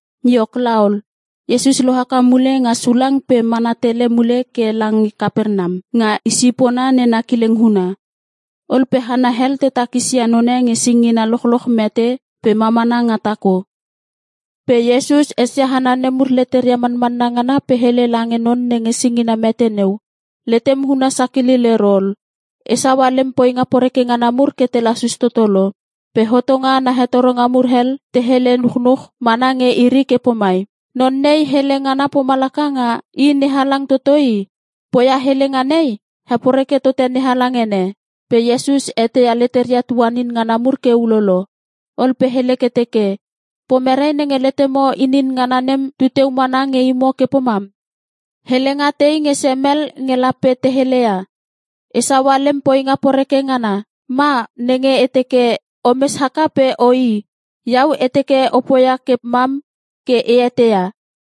Iok laol, Iesus lo haka mule nga sulang pe mana tele mule ke lange Kapernam, nga i sipona nena kileng huna. Ol pe hana hel te takis ia none nge singina lochloch mete pe mamana nga tako. Pe Iesus esia hana nemur leteria manmanna ngana pe hele lange non nenge singina mete neu, “Letem huna sakilil ero ol. E saua lem poinga poreke ngana mur ke te lasus toto lo.” Pe hotonga ana hetoronga mur hel, te hele chunuch mana nge iri ke pomai, “Non nei hele ngana pomalaka nga I NeHalang toto i. Poia helenga nei, heporeke tote NeHalang ene.” Pe Iesus eteia leteria tuanin ngana mur ke ulolo. Ol pe hele ke teke, “Pomere nenge letemo inin ngana nem tu teu mana nge imo ke pomam? Helenga tei nge semel nge lape te heleia? ‘E saua lem poinga poreke ngana,’ ma nenge e teke, ‘O mes haka pe o i.’? Iau e teke e poia ke mam ke a eteia,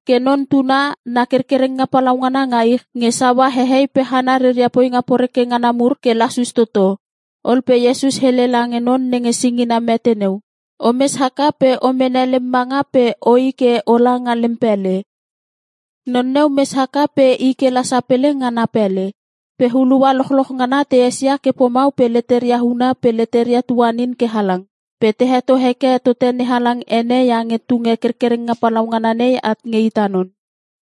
ke Non Tuna na kerkerenga palaungana nga ich, nge saua hehei pe hana reria poinga poreke ngana mur ke lasus toto.” Ol pe Iesus hele lange non nenge singina mete neu, “O mes haka pe o mene lem manga pe o i ke o la nga lem pele.” Non neu mes haka pe i ke la sapele nga na pele. Pe hulua lochloch ngana te esia ke pomau pe leteria huna pe leteria tuanin ke halang. Pe te heto heke tote NeHalang ene iange tunge kerkerenga palaungana nei at nge ita non.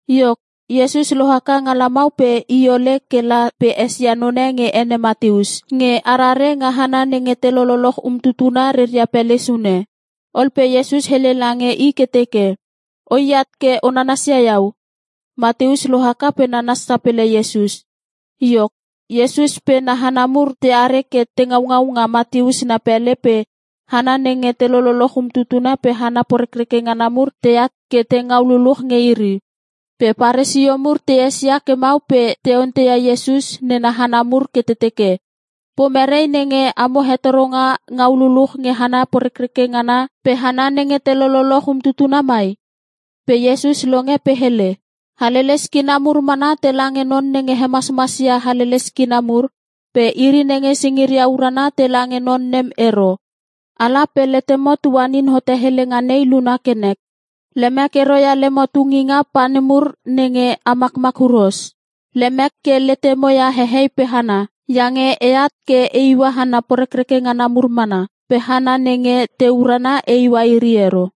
Iok, Iesus lo haka nga lamau pe i ole ke la pe esia none nge ene Mateus, nge arare nga hana nenge te lololoch umtutuna reria pele sune. Ol pe Iesus hele lange i ke teke, “O i at ke o nanasia iau.” Mateus lo haka pe nanas sapele Iesus. Iok, Iesus pe na hana mur teare ke te ngaungau nga Mateus na pele pe hana nenge te lololoch umtutuna pe hana porekreke ngana mur teat ke te ngau luluch nge iri. Pe Paresio mur te esia ke mau pe te onteia Iesus nena hana mur ke te teke, “Pomere nenge amo hetoronga ngau luluch nge hana porekreke ngana pe hana nenge te lololoch umtutuna mai?” Pe Iesus longe pe hele, “Haleles kina mur mana tela nge non nenge hemasmas ia haleles kina mur, pe iri nenge singiria urana tela nge non nem ero. Ala pe letemo tuanin hote helenga nei luna ke nek. ‘Lemek ero ia lemo tunginga pa nemur nenge a makmak huros. Lemek ke letemo ia hehei pe hana.’ Iange e at ke e iua hana porekreke ngana mur mana, pe hana nenge te urana e iua iri ero.”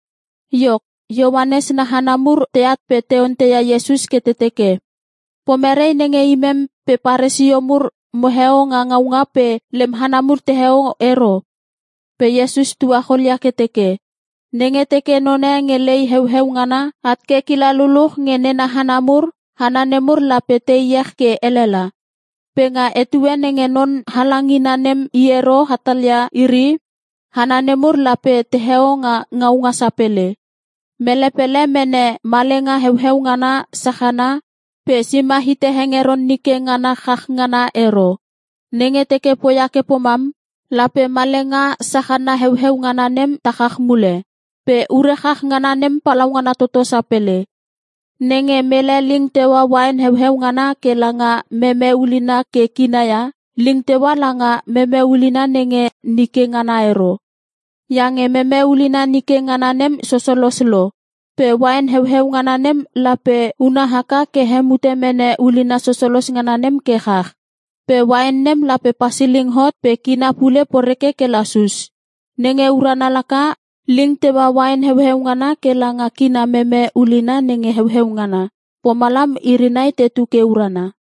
Iok, Ioanes na hana mur teat pe te onteia Iesus ke te teke, “Pomerei nenge imem pe Paresio mur moheo nga ngaunga pe lem hana mur teheo ero?” Pe Iesus tuacholia ke teke, “Nenge teke none nge lei heueu ngana at ke kila luluch nge nena hana mur, hana nemur lape te iech ke elela. Pe nga etue nenge non halangina nem i ero hatalia iri, hana nemur lape teheo nga ngaunga sapele. “Mele pele mene malenga heueu ngana sachana, pe sima hite hengeron nike ngana chach ngana ero. Nenge teke poia ke pomam, lape malenga sachana heueu ngana nem ta chach mule. Pe ure chach ngana nem palaungana toto sapele. Nenge mele ling teua uain heueu ngana ke langa meme ulina ke kina ia, ling teua langa meme ulina nenge nike ngana ero, iange meme ulina nike ngana nem sosolos lo, pe uain heueu ngana nem lape una haka ke hemute meme ulina sosolos ngana nem ke chach. Pe uain nem lape pasiling hot pe kina pule poreke ke lasus. Nenge urana laka, ling teua uain heueu ngana ke langa kina meme ulina nenge heueu ngana. Pomalam iri nai tetu ke urana.”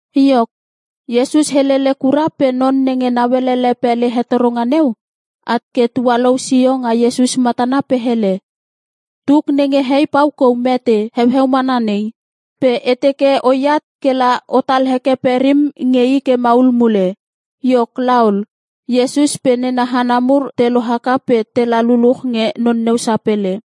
Iok, Iesus helele kura pe non nenge nauelele pele hetoronga neu, at ke tualou sio nga Iesus matana pe hele, “Tuk nenge hei pau kou mete heueu mana nei. Pe e teke o i at ke la otal heke perim nge i ke maul mule.” Iok laol, Iesus pe nena hana mur te lo haka pe tela luluch nge non neu sapele.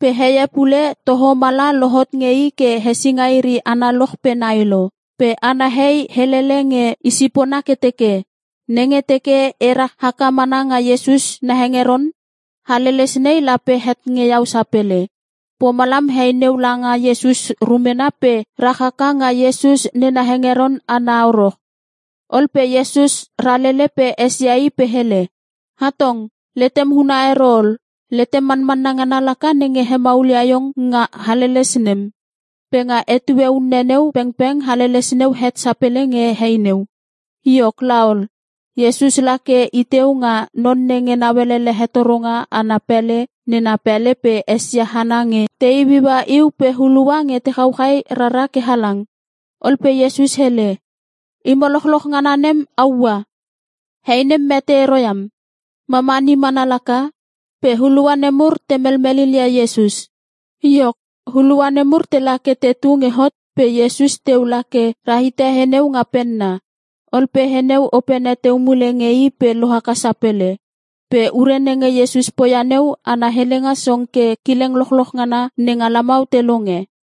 Pe heie pule toho mala lohot nge i ke hesinga iri analoch pe nai lo. Pe ana hei helele nge i sipona ke teke, “Nenge teke e ra haka mana nga Iesus na hengeron, haleles nei lape het nge iau sapele.” Pomalam hei neu langa Iesus rumena pe rahaka nga Iesus nena hengeron ana horo. Ol pe Iesus ralele pe esia i pe hele, “Hatong, letem huna ero ol. Letem manmanna ngana laka nenge hemaulia iong nga haleles nem.” Pe nga etue unne neu pengpeng haleles neu het sapele nge hei neu. Iok laol, Iesus la ke i teu nga non nenge nauelele hetoronga ana pele nena pele pe esia hana nge te iuiua iu pe hulua nge te chauchai rara ke halang. Ol pe Iesus hele, “Imo lochloch ngana nem a ua! He nem mete ero iam, mamani mana laka.” Pe hulua nemur te melmel lil ia Iesus. Iok, hulua nemur tela ke tetu nge hot pe Iesus teu la ke ra hite he neu nga penna. Ol pe he neu opene teu mule nge i pe lo haka sapele. Pe ure nenge Iesus poia neu ana helenga song ke kileng lochloch ngana nenga lamau te longe.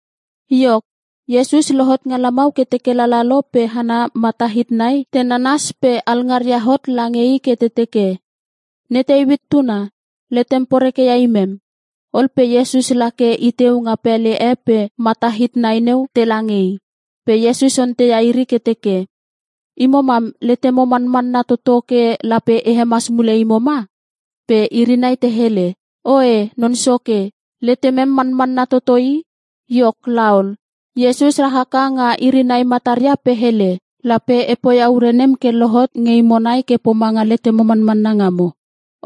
Iok, Iesus lohot nga lamau ke teke lalalo pe hana mata hit nai te nanas pe alngaria hot lange I ke te teke, “Ne Teuit tuna, letem poreke ia imem!” Ol pe Iesus la ke i teu nga pele e pe mata hit nai neu tela nge i. Pe Iesus onteia iri ke teke, “Imo mam letemo manmanna toto ke lape e hemas mule imo ma?” Pe iri nai te hele, “Oe Non Soke, letemem manmanna toto i.” Iok laol, Iesus ra haka nga iri nai mataria pe hele, “Lape e poia ure nem ke lohot nge imo nai ke pomanga letemo manmanna ngamo.”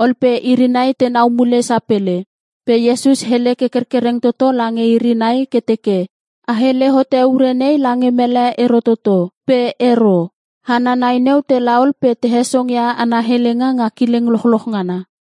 Ol pe iri nai tenau mule sapele. Pe Iesus hele ke kerkereng toto lange iri nai ke teke, “A hele hote ure nei lange mele ero toto.” Pe ero. Hana nai neu tela ol pe te hesongia ana helenga nga kileng lochloch ngana.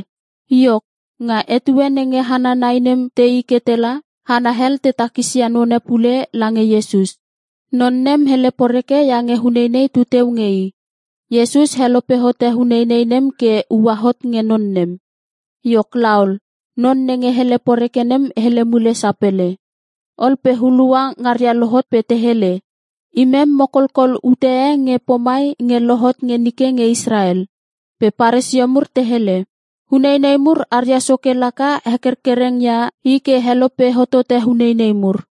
Iok, nga etue nenge hana nai nem te i ke tela, hana hel te takisia none pule lange Iesus. Non nem hele poreke iange uneinei tu teu nge i. Iesus helope hote uneinei nem ke ua hot nge non nem. Iok laol non nenge hele poreke nem hele mule sapele. Ol pe hulua ngaria lohot pe te hele, “Imem mo kolkol ute e nge pomai nge lohot nge nike nge Israel.” Pe Paresio mur te hele, “Uneinei mur aria soke laka hekerkereng ia i ke helope hotote uneinei mur.”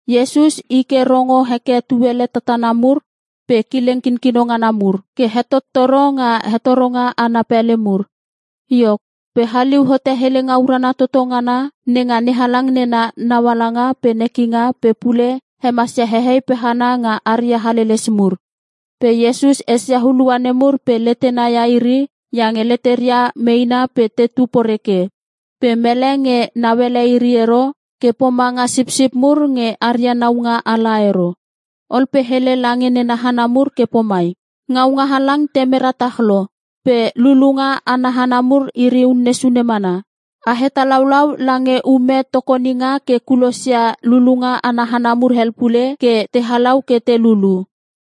Iesus i ke rongo heke tuele tatana mur pe kileng kinkino ngana mur, ke hetottoro nga hetoronga ana pele mur. Iok, pe haliu hote helenga urana toto ngana nenga NeHalang nena naualanga pe nekinga pe pule hemasia hehei pe hana nga aria haleles mur. Pe Iesus esia hulua nemur pe letena ia iri iange leteria meena pe tetu poreke, pe mele nge nauele iri ero ke pomanga sipsip mur nge aria naunga ala ero. Ol pe hele lange nena hana mur ke pomai, “Ngaunga halang te mera tach lo. Pe lulunga ana hana mur iri unne sune mana. A hetalaulau lange ume tokoninga ke kulosia lulunga ana hana mur hel pule ke te halau ke te lulu.”